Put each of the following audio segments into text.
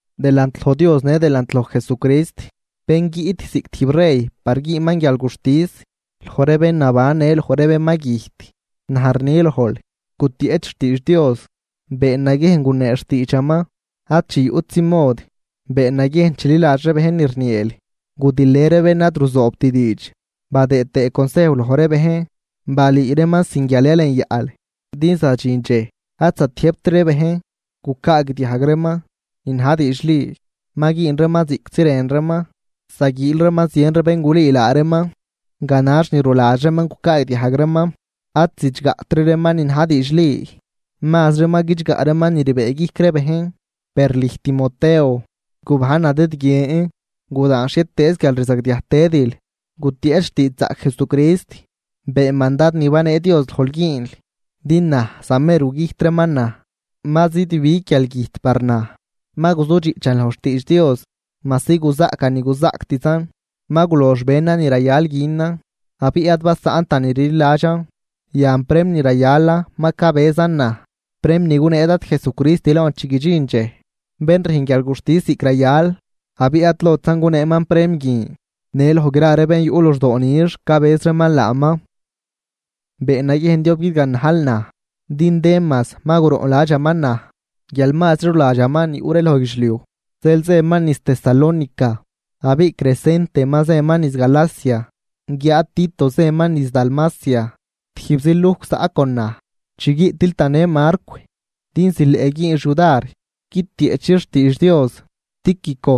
Delant loj Dios në delant loj Jesucrist, bén guiꞌt ziꞌc tijb rey par güünman guialguxtis loj ree bén naban në loj ree bén ma güjt, naj rni lojl, gutieꞌch xtiidx Dios. Been naguiejn gunee xtiidxaman ad chi yuꞌtzi mod. Been naguiejn chililadx ree bejn ni rnieel, gudilë ree bén ad ruzoobt diidx, badëë tëë consejw loj ree bejn, balüü reeman sin guial yalenyaꞌl. Din zadxin dxej ad zatiëjbt ree bejn gucaagdiajg reeman ni na̱j diidxli, ma güün reeman ziꞌctzi rën reeman, zaguiil reeman zien ree bén gulüü laa reeman ganax ni ruladx reeman gucaagdiajg reeman. Ad zidxgaꞌtri reeman ni na̱j diidxli, mazri ma guidxgaꞌ reeman ni rbëëguijc ree bejn. Per lüj Timoteo, gubajn nadëdguien, gudaan xhietëëz guialrzagdiaj tëdil, gutieꞌch xtiidxzaꞌc Jesucrist, been mandad ni banee Dios lojl güünl. Din naj zamer gugüjt reeman naj, ma zidbig guialgüjt par naj. Ma guzudxiꞌchan loj xtiidx Dios majsi guzaꞌcan ni guzaꞌctzan, ma gulox benan ni rayal günan abiꞌ ad basaꞌntan ni rliladxan. Yan prem ni rayalan ma cabëzan naj, prem ni gunee Dad Jesucrist lon chi guidxin dxej, bén rüjn guialguxtis ziꞌc rayal. Abiꞌ ad lotzan guneeman prem guin, në loj gra ree bén yuꞌ luxdoo nix cabëz reeman laaman. Been naguiejn diob guidganajl naj, din Demas ma guroꞌnladxaman naj guial mazri ruladxaman ni yuꞌ ree loj guidxliuj, zeel zëman niz Tesalónica. Abiꞌ Crescente ma zëman niz Galacia guiáad Tito zëman niz Dalmacia. Tijbzi Lujc zaꞌ con naj. Chi guiꞌtil tanë Marcw din zileꞌ güünx yudar guitieꞌchix xtiidx Dios. Tíquico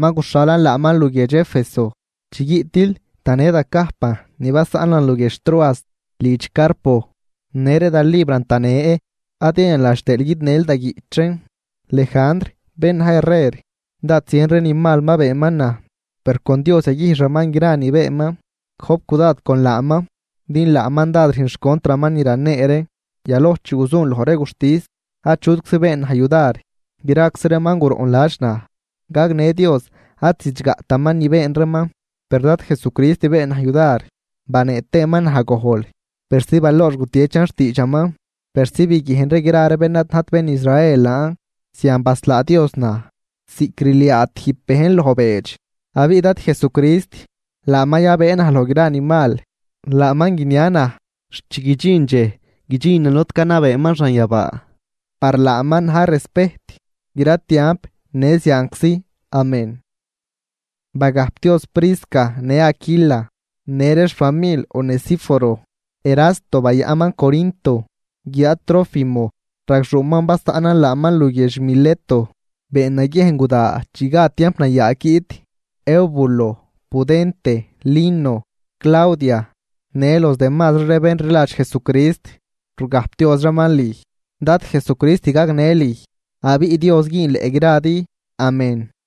ma guxhalan laaman luguiedx Éfeso. Chi guiꞌtil tanë da cajpan ni basaꞌnan luguiedx Troas lidx Carpo, në ree da libran tanë ad yayanladx tëël guidnël da guiꞌch reen. Lejandr bén na̱j herrer, dád zien ree ni mal ma beenman naj, per con Dios yaguijxaman gra ni beenman. Gojp cudad con laaman, din laaman dád rüjn xcontraman ni ranee ree. Yaloj chi guzun loj ree guxtis achutczi been naj yudar, graczi reeman guroꞌnladx naj. Gagnë Dios ad zidxgaꞌtaman ni been reeman. Per Dad Jesucrist been naj yudar banee tëëman naj gojl persi baloox gutiechan xtiidxaman, persi biguiejn ree gra ree bén ad najt bén Israel laan. Zian baslaa Dios naj, ziꞌc rliaa tijb bejn loj beedx. Abiꞌ Dad Jesucrist, laaman yabëë naj loj gra ni mal, laaman guinia naj xt chi guidxin dxej guidxinan lod canabeeman xanyabaa. ¡Par laaman na̱j respejt gra tiamp në zianczi! Amén. Bagajpdioz Prisca në Aquila në ree xfamil Onesíforo. Erasto bayaꞌnman Corinto, guiáad Trófimo ragxuuman basaꞌnan laaman luguiedx Mileto. Been naguiejn guda chi gad tiamp nayaag guiꞌt. Eubulo, Pudente, Lino, Claudia në los demasri ree bén rliladx Jesucrist rugajpdioz reeman lüj. Dad Jesucrist gagnë lüj, abiꞌ Dios güünleꞌ gradi. Amén.